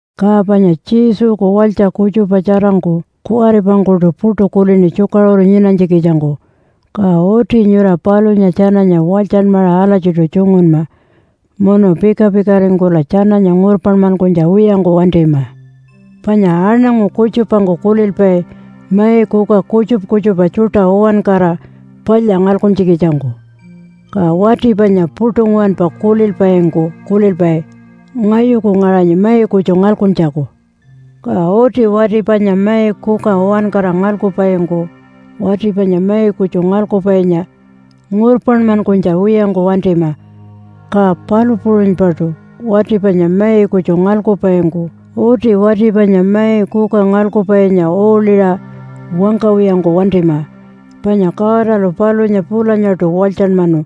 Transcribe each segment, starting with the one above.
Ka panya Jesuku walytja kutjupa tjarangku kuwaripangkuṯu puṯu kulini tjukaṟuru nyinanytjikitjangku. Ka uti nyura palunya tjananya walytjanmaṟa alatjiṯu tjungunma, munu pika-pikaringkula tjananya ngurpanmankunytja wiyangku wantima. Panya aṉangu kutjupangku kulilpai mai kuka kutjupa kutjupa tjuṯa uwankara palya ngalkuntjikitjangku. Ka wati panya puṯu nguwanpa kulilpaingku kulilpai, “Ngayuku ngaṟanyi mai kutju ngalkuntjaku.” Ka uti wati panya mai kuka uwankara ngalkupaingku wati panya mai kutju ngalkupainya ngurpanmankunytja wiyangku wantima, ka palu puṟunypaṯu wati panya mai kutju ngalkupaingku uti wati panya mai kuka ngalkupainya uuḻiṟa wangkawiyangku wantima, panya Godalu palunya pulanyaṯu walytjanmanu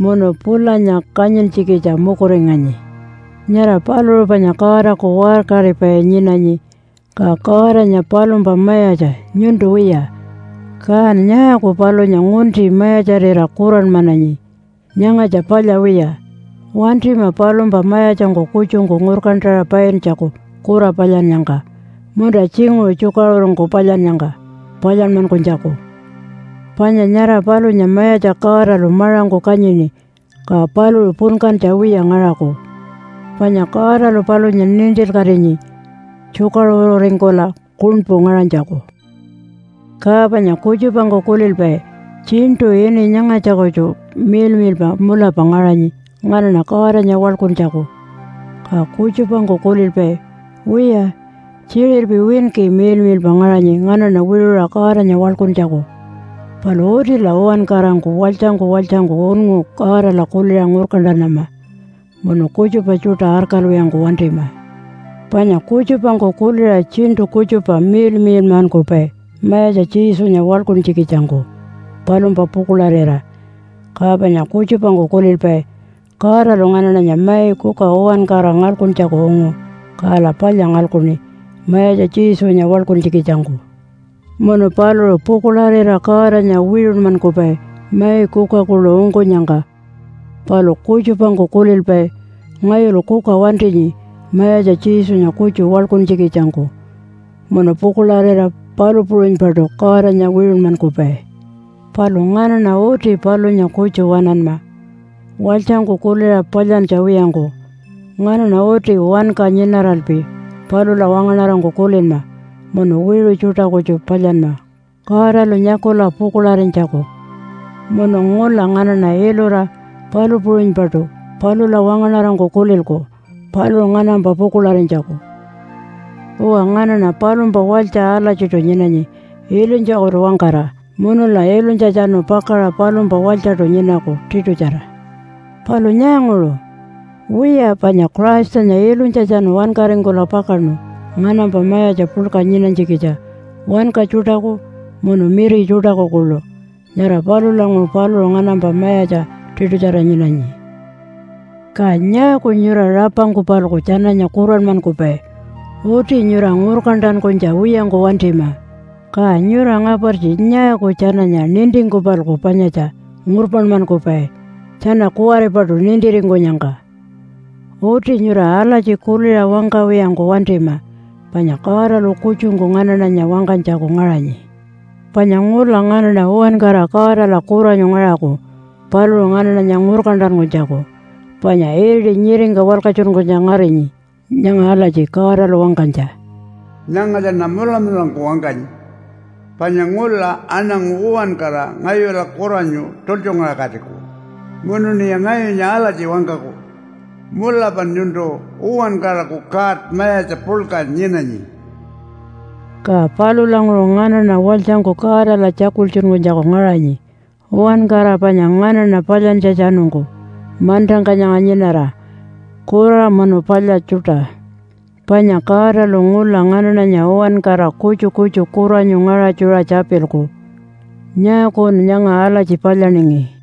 munu pulanya kanyintjikitja mukuringanyi. Nyara paluṟu panya Godaku waṟkaripai nyinanyi, ka Godanya palumpa mayatja nyuntu wiya. Kan nyaaku palunya ngunti mayatjarira kuranmananyi? Nyangatja palya wiya. Wantima palumpa mayatjangku kutjungku ngurkantaṟa paintjaku kura palyannyangka, munta tjinguṟu tjukaṟurungku palyannyangka palyanmankunytjaku. Panya nyara palunya Mayatja Godalu maṟangku kanyini, ka paluṟu punkantja wiya ngaṟaku. Panya Godalu palunya nintilkatinyi tjukaṟururingkula kuṉpu ngaṟanytjaku. Ka panya kutjupangku kulilpai, “Tjiṉṯu ini nyangatja kutju miḻmiḻpa mulapa ngaṟanyi nganaṉa Godanya waḻkuntjaku.” Ka kutjupangku kulilpai, “Wiya, tjiṟirpi winki miḻmiḻpa ngaṟanyi nganaṉa wiṟuṟa Godanya waḻkuntjaku.” Palu utila uwankarangku walytjangku walytjangku unngu Godala kuliṟa ngurkantanama, munu kutjupa tjuṯa arkalwiyangku wantima. Panya kutjupangku kuliṟa tjiṉṯu kutjupa miḻmiḻmankupai Mayatja Jesunya waḻkuntjikitjangku palumpa pukuḻarira. Ka panya kutjupangku kulilpai, “Godalu nganaṉanya mai kuka uwankara ngalkuntjaku ungu, kala palya ngalkuṉi Mayatja Jesunya waḻkuntjikitjangku.” Munu paluṟu pukuḻarira Godanya wiṟunmankupai mai kuka kuḻu ungkunyangka. Palu kutjupangku kulilpai, “Ngayulu kuka wantinyi Mayatja Jesunya kutju waḻkuntjikitjangku.” Munu pukuḻarira palu puṟunypaṯu Godanya wiṟunmankupai. Palu nganaṉa uti palunya kutju waṉanma walytjangku kuliṟa palyantja wiyangku. Nganaṉa uti wanka nyinaralpi palula wangaṉarangku kulinma munu wiṟu tjuṯa kutju palyanma Godalu nyakula pukuḻarinytjaku. Munu ngula nganaṉa ilura palu puṟunypaṯu palula wangaṉarangku kulilku paluṟu nganampa pukuḻarinytjaku. Uwa, nganaṉa palumpa walytja alatjiṯu nyinanyi ilunytjakutu-wangkara munula ilunytjatjanu pakaṟa palumpa walytjaṯu nyinaku tiṯutjara. Palu nyaanguṟu? Wiya, panya Christanya ilunytjatjanu wankaringkula pakaṉu nganampa mayatja puḻka nyinanytjikitja wanka tjuṯaku munu miri tjuṯaku kuḻu. Nyara palulanguṟu paluṟu nganampa mayatja tiṯutjara nyinanyi. Ka nyaaku nyura rapangku-palku tjananya kuranmankupai? Uti nyura ngurkantankunytja wiyangku wantima. Ka nyura ngapartji nyaaku tjananya nintingku-palku panyatja ngurpanmankupai tjana kuwaripaṯu nintiringkunyangka? Uti nyura alatji kuliṟa wangkawiyangku wantima. Panya Godalu kutjungku nganaṉanya wangkanytjaku ngaṟanyi. Panya ngula nganaṉa uwankara Godala kuranyu ngaṟaku paluṟu nganaṉanya ngurkantankunytjaku. Panya iriti nyiringka walkatjunkunytja ngarinyi nyanga alatji Godalu wangkanytja, “Nyangatjaṉa mulamulangku wangkanyi, panya ngula aṉangu uwankara ngayula kuranyu tultjungaṟakatiku. Munuṉiya ngayunya alatji wangkaku, ‘Mulapan nyuntu uwankaraku God Mayatja puḻka nyinanyi.’” Ka palulanguṟu nganaṉa walytjangku Godala tjakultjunkunytjaku ngaṟanyi uwankara panya nganaṉa palyantjatjanungku mantangka nyanga nyinara, kura munu palya tjuṯa. Panya Godalu ngula nganaṉanya uwankara kutju kutju kuranyu ngaṟatjuṟa tjapilku, “Nyaakun nyanga alatji palyaningi?”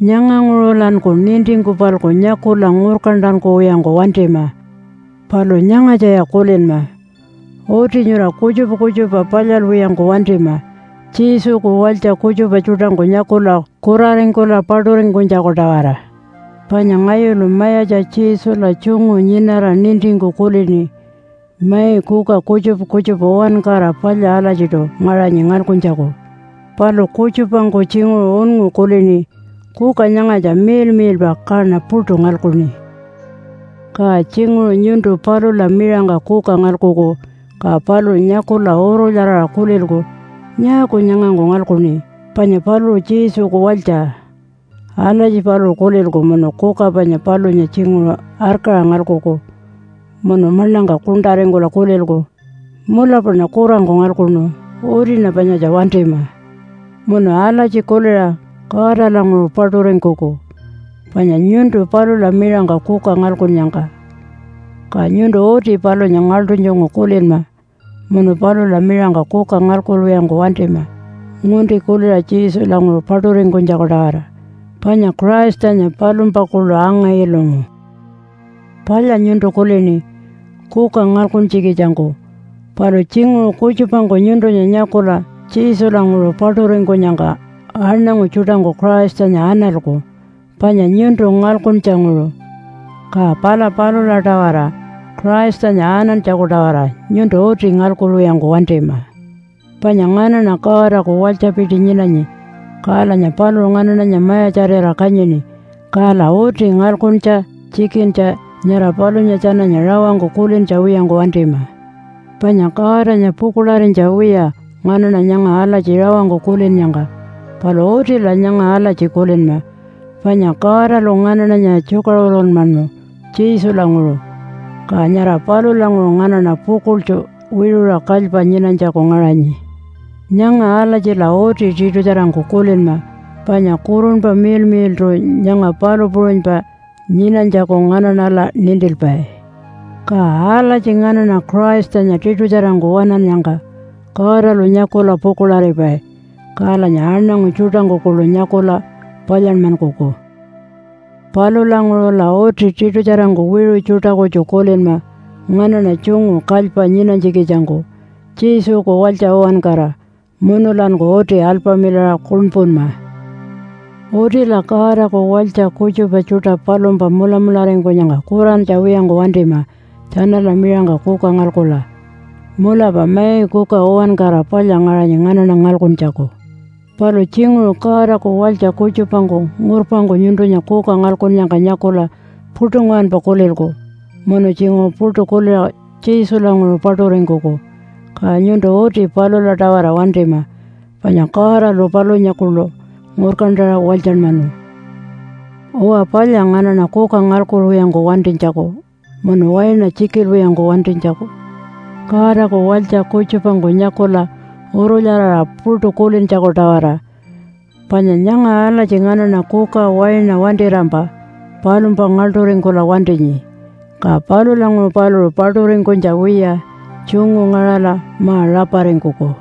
Nyanganguṟulanku nintingku-palku nyakula ngurkantankuwiyangku wantima. Palu nyangatjaya kulinma! Uti nyura kutjupa kutjupa palyalwiyangku wantima Jesuku walytja kutjupa tjuṯangku nyakula kuraringkula paṯuringkunytjaku-tawara. Panya ngayulu Mayatja Jesula tjungu nyinara nintingku kulini mai kuka kutjupa kutjupa uwankara palya alatjiṯu ngaṟanyi ngalkuntjaku. Palu kutjupangku tjinguṟu unngu kulini, “Kuka nyangatja miḻmiḻpa kaṉa puṯu ngalkuṉi.” Ka tjinguṟu nyuntu palula miṟangka kuka ngalkuku, ka paluṟu nyakula urulyaraṟa kulilku, “Nyaaku nyangangku ngalkuṉi? Panya paluṟu Jesuku walytja.” Alatji paluṟu kulilku munu kuka panya palunya tjinguṟu arkaṟa ngalkuku, munu maḻangka kuṉṯaringkula kulilku, “Mulapaṉa kurangku ngalkuṉu. Utiṉa panyatja wantima.” Munu alatji kuliṟa Godalanguṟu paṯuringkuku panya nyuntu palula miṟangka kuka ngalkunnyangka. Ka nyuntu uti palunya ngaḻṯunytjungku kulinma munu palula miṟangka kuka ngalkuwiyangku wantima, ngunti kuliṟa Jesulanguṟu paṯuringkunytjaku-tawara, panya Christanya palumpa kuḻu anga-ilungu. Palya nyuntu kulini kuka ngalkuntjikitjangku, palu tjinguṟu kutjupangku nyuntunya nyakula Jesulanguṟu paṯuringkunyangka aṉangu tjuṯangku Christanya analku panya nyuntu ngalkuntjanguṟu. Ka pala palula-tawara Christanya anantjaku-tawara nyuntu uti ngalkuwiyangku wantima. Panya nganaṉa Godaku walytjapiti nyinanyi kalanya paluṟu nganaṉanya mayatjarira kanyini. Kala uti ngalkuntja tjikintja nyara palunya tjananya rawangku kulintja wiyangku wantima. Panya Godanya pukuḻarinytja wiya nganaṉa nyanga alatji rawangku kulinnyangka. Palu utila nyanga alatji kulinma, panya Godalu nganaṉanya tjukaṟurunmanu Jesulanguṟu, ka nyara palulanguṟu nganaṉa pukuḻtju wiṟuṟa kalypa nyinanytjaku ngaṟanyi. Nyanga alatjila uti tiṯutjarangku kulinma, panya Kurunpa Miḻmiḻṯu nyanga palu puṟunypa nyinanytjaku nganaṉala nintilpai. Ka alatji nganaṉa Christanya tiṯutjarangku waṉannyangka Godalu nyakula pukuḻaripai, kalanya aṉangu tjuṯangku kuḻu nyakula palyanmankuku. Palulanguṟula uti tiṯutjarangku wiṟu tjuṯa kutju kulinma nganaṉa tjungu kalypa nyinanytjikitjangku Jesuku walytja uwankara, munulanku uti alpamilaṟa kuṉpunma. Utila Godaku walytja kutjupa tjuṯa palumpa mulamularingkunyangka kurantja wiyangku wantima tjanala miṟangka kuka ngalkula. Mulapa mai kuka uwankara palya ngaṟanyi nganaṉa ngalkuntjaku. Palu tjinguṟu Godaku walytja kutjupangku ngurpangku nyuntunya kuka ngalkunnyangka nyakula puṯu nguwanpa kulilku munu tjinguṟu puṯu kuliṟa Jesulanguṟu paṯuringkuku. Ka nyuntu uti palula-tawara wantima, panya Godalu palunya kuḻu ngurkantaṟa walytjanmanu. Uwa, palya nganaṉa kuka ngalkuwiyangku wantinytjaku munu waina tjikilwiyangku wantinytjaku, Godaku walytja kutjupangku nyakula urulyaraṟa puṯu kulintjaku-tawara. Panya nyanga alatji nganaṉa kuka, waina wantirampa palumpa ngaḻṯuringkula wantinyi. Ka palulanguṟu paluṟu paṯuringkunytja wiya tjungu ngaṟala ma-raparingkuku.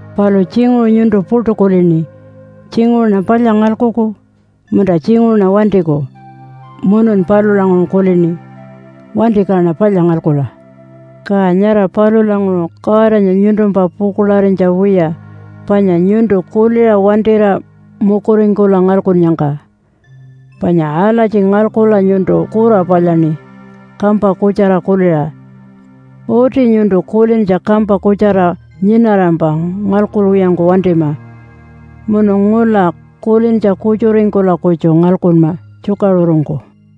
Palu tjinguṟu nyuntu puṯu kulini, “Tjinguṟuṉa palya ngalkuku, munta tjinguṟuṉa wantiku.” Munun palulanguṟu kulini, “Wanti kaṉa palya ngalkula.” Ka nyara palulanguṟu Godanya nyuntumpa pukuḻarinytja wiya panya nyuntu kuliṟa wantira mukuringkula ngalkunnyangka. Panya alatji ngalkula nyuntu kura palyaṉi kampa kutjara kuliṟa. Uti nyuntu kulintja kampa kutjara nyinarampa ngalkuwiyangku wantima munu ngula kulintja kutjuringkula kutju ngalkunma tjukaṟurungku.